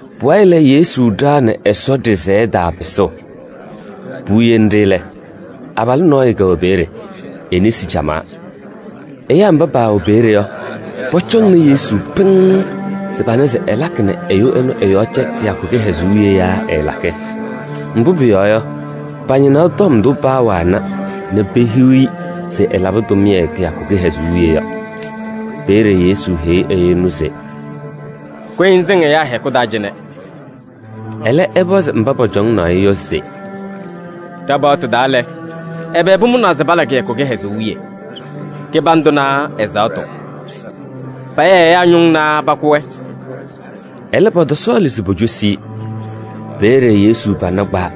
Pʋwayɩ lɛ, Yesu ɖaɣnɩ Ɛsɔ ɖɩsɛyɛ taa pɩsʋʋ. Puwiye nɖɩ lɛ, abalʋ nɔɔyʋ kɛwɛ peeye, e-nesi camaa. Ɛyaa mba paawɛ peeye yɔ, pɔcɔŋnɩ Yesu pɩŋŋ se pana se ɛlakɩ nɛ ɛyʋ ɛnʋ ɛ-yɔɔ cɛ kɩyakʋ kɩhɛzʋʋ wiye yaa ɛɛlakɩ? Mbʋ pʋyɔɔ yɔ, pañɩnaɣ tɔm ndʋ paawana nɛ pehiɣ-i se ɛlabɩ tʋmɩyɛ kɩyakʋ kɩhɛzʋʋ wiye yɔ. Peeye Yesu heyi ɛyʋ ɛnʋ se: “Kʋyɩ ŋsɩŋ ɛyaa hɛkʋ taa cɩnɛ!” Ɛlɛ, ɛpɔzɩ mba pɔcɔŋaɣnɩ-ɩ yɔ se: “Ɖa-paɣtʋ taa lɛ, ɛbɛ pʋmʋnaa se pala kɩyakʋ kɩhɛzʋʋ wiye? Kɩbandʋ naa ɛzaɣtʋ? Paya ɛyaa ñʋŋ naa pakʋ-wɛ?” Ɛlɛ, pɔtɔsɔɔlɩ se pocosi-i. Peeye Yesu pana kpawa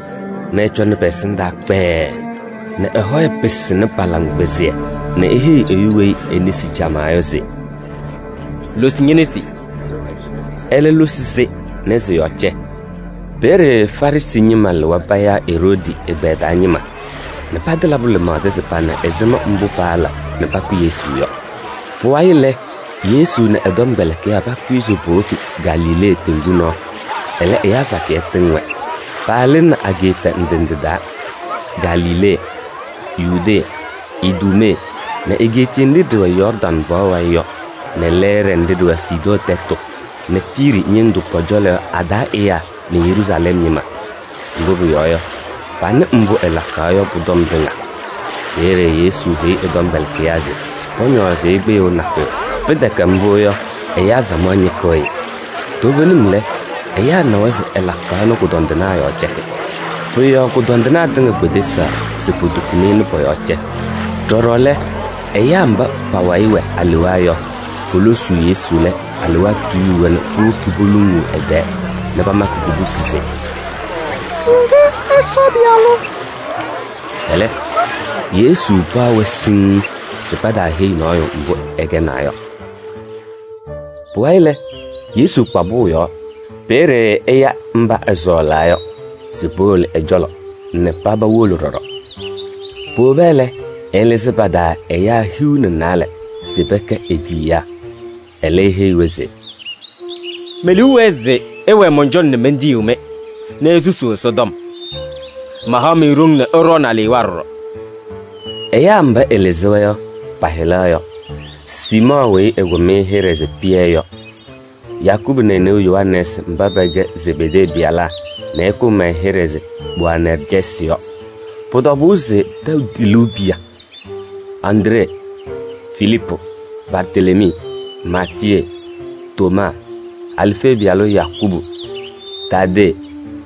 nɛ ɛcɔnɩ pɛ-ɛsɩndaa kpɛɛɛ nɛ ɛ-hɔyɛ pɩsɩnɩ pa-laŋkpɩzɩyɛ nɛ eheyi ɛyʋ weyi e-nesi camaa yɔ se: “Losi ñe-nesi.” Ɛlɛ losi-sɩ nɛ sɩ-yɔɔ cɛ. Peeye Farɩsɩ ñɩma lɩwa payaa Eroodi ɛgbɛyɛ taa ñɩma nɛ patɩlabʋ lɩmaɣza se pana ɛzɩma mbʋ paala nɛ pakʋ Yesu yɔ. Pʋwayɩ lɛ, Yesu nɛ ɛ-tɔmkpɛlɩkɩyaa pakʋyɩ se powoki Galilee teŋgu nɔɔ, ɛlɛ ɛyaa sakɩyɛ tɩŋ-wɛ. Paalɩnɩ ageeta ndɩ ndɩ taa: Galilee nɛ Yudee nɛ Iduumee nɛ egeetiye nɖɩ ɖɩwɛ Yɔɔrdaŋ pɔɔ wayɩ yɔ nɛ lɛɛɖɛ nɖɩ ɖɩwɛ Sidɔɔ tɛtʋ nɛ Tiiri ñɩndʋ pɔ-cɔlɔ yɔ a-taa ɛyaa nɛ Yeruusalɛm ñɩma. Mbʋ pʋyɔɔ yɔ, panɩ mbʋ ɛlakaɣ yɔ pʋ-tɔm tɩŋa. Peeye Yesu heyi ɛ-tɔmkpɛlɩkɩyaa se pɔñɔɔzɩ-ɩ kpɩyʋʋ nakʋyʋ. Pɩtɛkɛ mbʋ yɔ, ɛyaa samaɣ ñɩkɩɣ-ɩ. Toovenim lɛ, ɛyaa nawa se ɛlakaɣ nɛ kʋdɔndɩnaa yɔɔ cɛkɩ. Pʋ-yɔɔ kʋdɔndɩnaa tɩŋa kpedesaɣ se potukuni-i nɛ pɔ-yɔɔ cɛ. Ɖɔɖɔ lɛ, ɛyaa mba pa-wayɩ wɛ alewaa yɔ, polosuu Yesu lɛ, alewaa tuyuu-wɛ nɛ powoki poluŋuu ɛ-tɛɛ nɛ pamakɩ kubusi se: “Ña lɛ Ɛsɔ Pɩyalʋ.” Ɛlɛ, Yesu paɣ-wɛ siŋŋ se pataaheyi nɔɔyʋ mbʋ ɛkɛnaa yɔ. Pʋwayɩ lɛ, Yesu kpa pʋʋ yɔɔ. Peeye ɛya mba ɛsɔɔlaa se powolo ɛ-cɔlɔ yɔ nɛ paba wolo ɖɔɖɔ. Powoba lɛ, ɛlɩzɩ pa-taa ɛyaa hiu nɛ naalɛ se pɛkɛ e-tiyiyaa. Ɛlɛ, eheyi-wɛ se: “Me-liu wɛɛ se ɩwɛɛ mɔn-cɔlɔ nɛ mentiyiɣ-mɩ nɛ isusuu Ɛsɔtɔm. Mahaɣ-mɩ ɖoŋ se ɩɖɔɔnɩ alewaa ɖɔɖɔ.” Ɛyaa mba ɛlɩzɩ-wɛ yɔ, pa-hɩla yɔ: Siimɔɔ weyi ɛkʋm-ɩ hɩɖɛ se Pɩyɛ yɔ nɛ Yakubu nɛ e-neu Yohanɛɛsɩ mba pɛkɛ Zebedee pɩyalaa nɛ ɛkʋm-wɛ hɩɖɛ se Boanɛrjɛsɩ yɔ. Pʋ-tɔbʋʋ se tɛʋ tiluu piya nɛ Andree nɛ Filiipu nɛ Bartelemii nɛ Maatiyee nɛ Tomaa nɛ Alfee pɩyalʋ Yakubu nɛ Taadee nɛ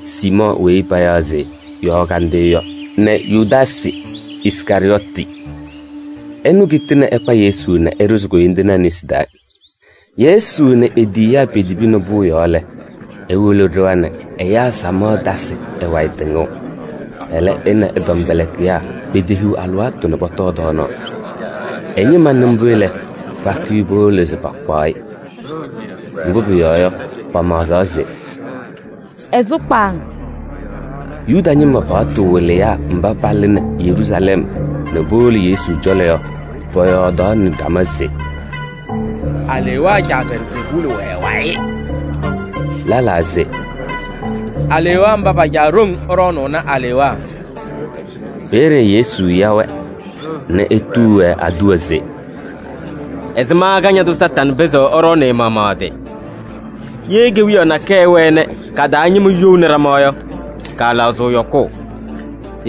Siimɔɔ weyi payaɣ se Yɔɔ Kandɩyʋ yɔ nɛ Yudaasɩ Iskarɩyɔɔtɩ. Ɛnʋ kitini ɛkpa Yesu nɛ ɛɖʋzɩ koyindinaa nesi taa. Yesu nɛ e-tiyiyaa petibini pʋʋ yɔɔ lɛ, ewolo ɖɩɣa nɛ ɛyaa samaɣ tasɩ ɛ-wayɩ tɩŋʋʋ. Ɛlɛ, ɛ nɛ ɛ-tɔmkpɛlɩkɩyaa petehiɣ alɩwaatʋ se pɔtɔɔ tɔɔnaɣ. Ɛ-ñɩma nɩ mbʋ lɛ, pakʋyɩ powolo se pakpaɣ-ɩ. Mbʋ pʋyɔɔ yɔ, pamaɣzaɣ se: “Ɛsʋ kpaaŋ.” Yuda ñɩma paɣtʋ wɩlɩyaa mba palɩnɩ Yeruusalɛm nɛ powolo Yesu cɔlɔ yɔ, pɔyɔɔdaɣnɩ ɖama se: “Alewaa caa Belzeebuuli wɛ ɛ-wayɩ.” Lɛlaa se: “Alewaa mba pa-caa ɖoŋ ɛɖɔɔnʋʋnɩ alewaa.” Peeye Yesu ya-wɛ nɛ etuu-wɛ aduwa se: “Ɛzɩma Kañadʋ Satanɩ pɩzɩɣ ɛɖɔɔnɩ ɛ-maɣmaɣ ɛ-tɩ? Ye kewiyaɣ nakɛyɛ ɛwɛɛ nɛ ka-taa ñɩma youni ɖama yɔ, kaalaɣzɩɣ yɔkʋʋ.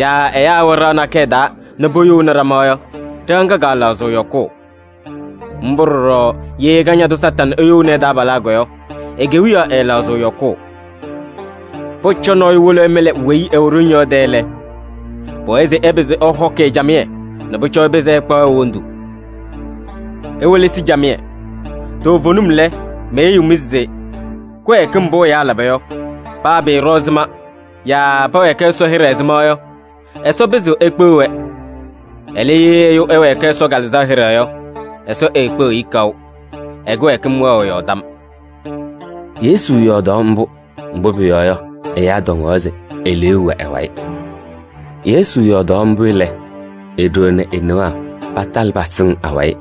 Yaa ɛyaa ɛwɛ ɖɩɣa nakɛyɛ taa nɛ poyouni ɖama yɔ, ɖɩɣa ŋga kaalaɣzɩɣ yɔkʋʋ. Mbʋ ɖɔɖɔ ye Kañadʋ Satanɩ eyouni ɛ-taabalaa yɔ, e-kewiyaɣ ɛɛlaɣzɩɣ yɔkʋʋ. Pʋcɔ nɔɔyʋ wolo ɛmɩlɩ weyi ɛwɛ ɖoŋ yɔ ɛ-tɛ lɛ, pʋwɛɛ se ɛpɩzɩ ɛhɔkɩ-ɩ camɩyɛ nɛ pʋcɔ ɛpɩzɩ ɛkpaɣ e-wondu. Iwelesi camɩyɛ, toovenim lɛ, meheyiɣ-mɩ se kɩwɛɛkɩm mbʋ ɛyaa laba yɔ, paa pɩɩɖɔ ɛzɩma yaa pɛwɛɛkɩ Ɛsɔ hɩɖɛ ɛzɩma yɔ, Ɛsɔ pɩzɩɣ ekpeɣ-wɛ. Ɛlɛ, ye ɛyʋ ɛwɛɛkɩ Ɛsɔ Kalɩzaɣ hɩɖɛ yɔ, Ɛsɔ eekpeɣiɣ-i kaʋ: ɛ-kɩwɛɛkɩm wɛɣ ɛ-yɔɔ tam.” Yesu yɔɔdaɣ mbʋ, mbʋ pʋyɔɔ yɔ, ɛyaa tɔŋaɣ se eleeu wɛ ɛ-wayɩ. Yesu yɔɔdaɣ mbʋ lɛ, e-ɖoo nɛ e-newaa patalɩ pasɩŋ awayɩ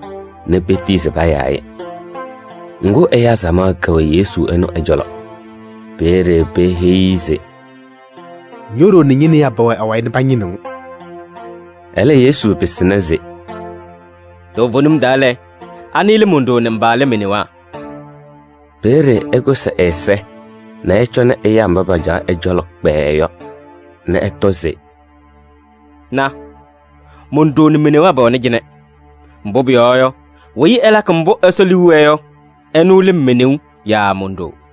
nɛ petiyi se payaa-ɩ. Ŋgʋ, ɛyaa samaɣ kɛwɛ Yesu ɛnʋ ɛ-cɔlɔ. Peeye peheyi-i se: “Na, Ño-ɖoo nɛ ñe-newaa pɛwɛ awayɩ nɛ pañɩnɩɣ-ŋ.” Ɛlɛ, Yesu pɩsɩna se: “Toovenim taa lɛ, anɩ lɛ mon-ɖoo nɛ mba lɛ me-newaa?” Peeye ɛkʋsɩ ɛ-ɛza nɛ ɛcɔnɩ ɛyaa mba pacaɣ ɛ-cɔlɔ kpɛɛɛ yɔ nɛ ɛtɔ se: “Na! Mon-ɖoo nɛ me-newaa pɛwɛnɩ cɩnɛ! Mbʋ pʋyɔɔ yɔ, weyi ɛlakɩ mbʋ Ɛsɔ liu wɛɛ yɔ, ɛnʋ lɛ me-neu yaa mon-ɖoo.”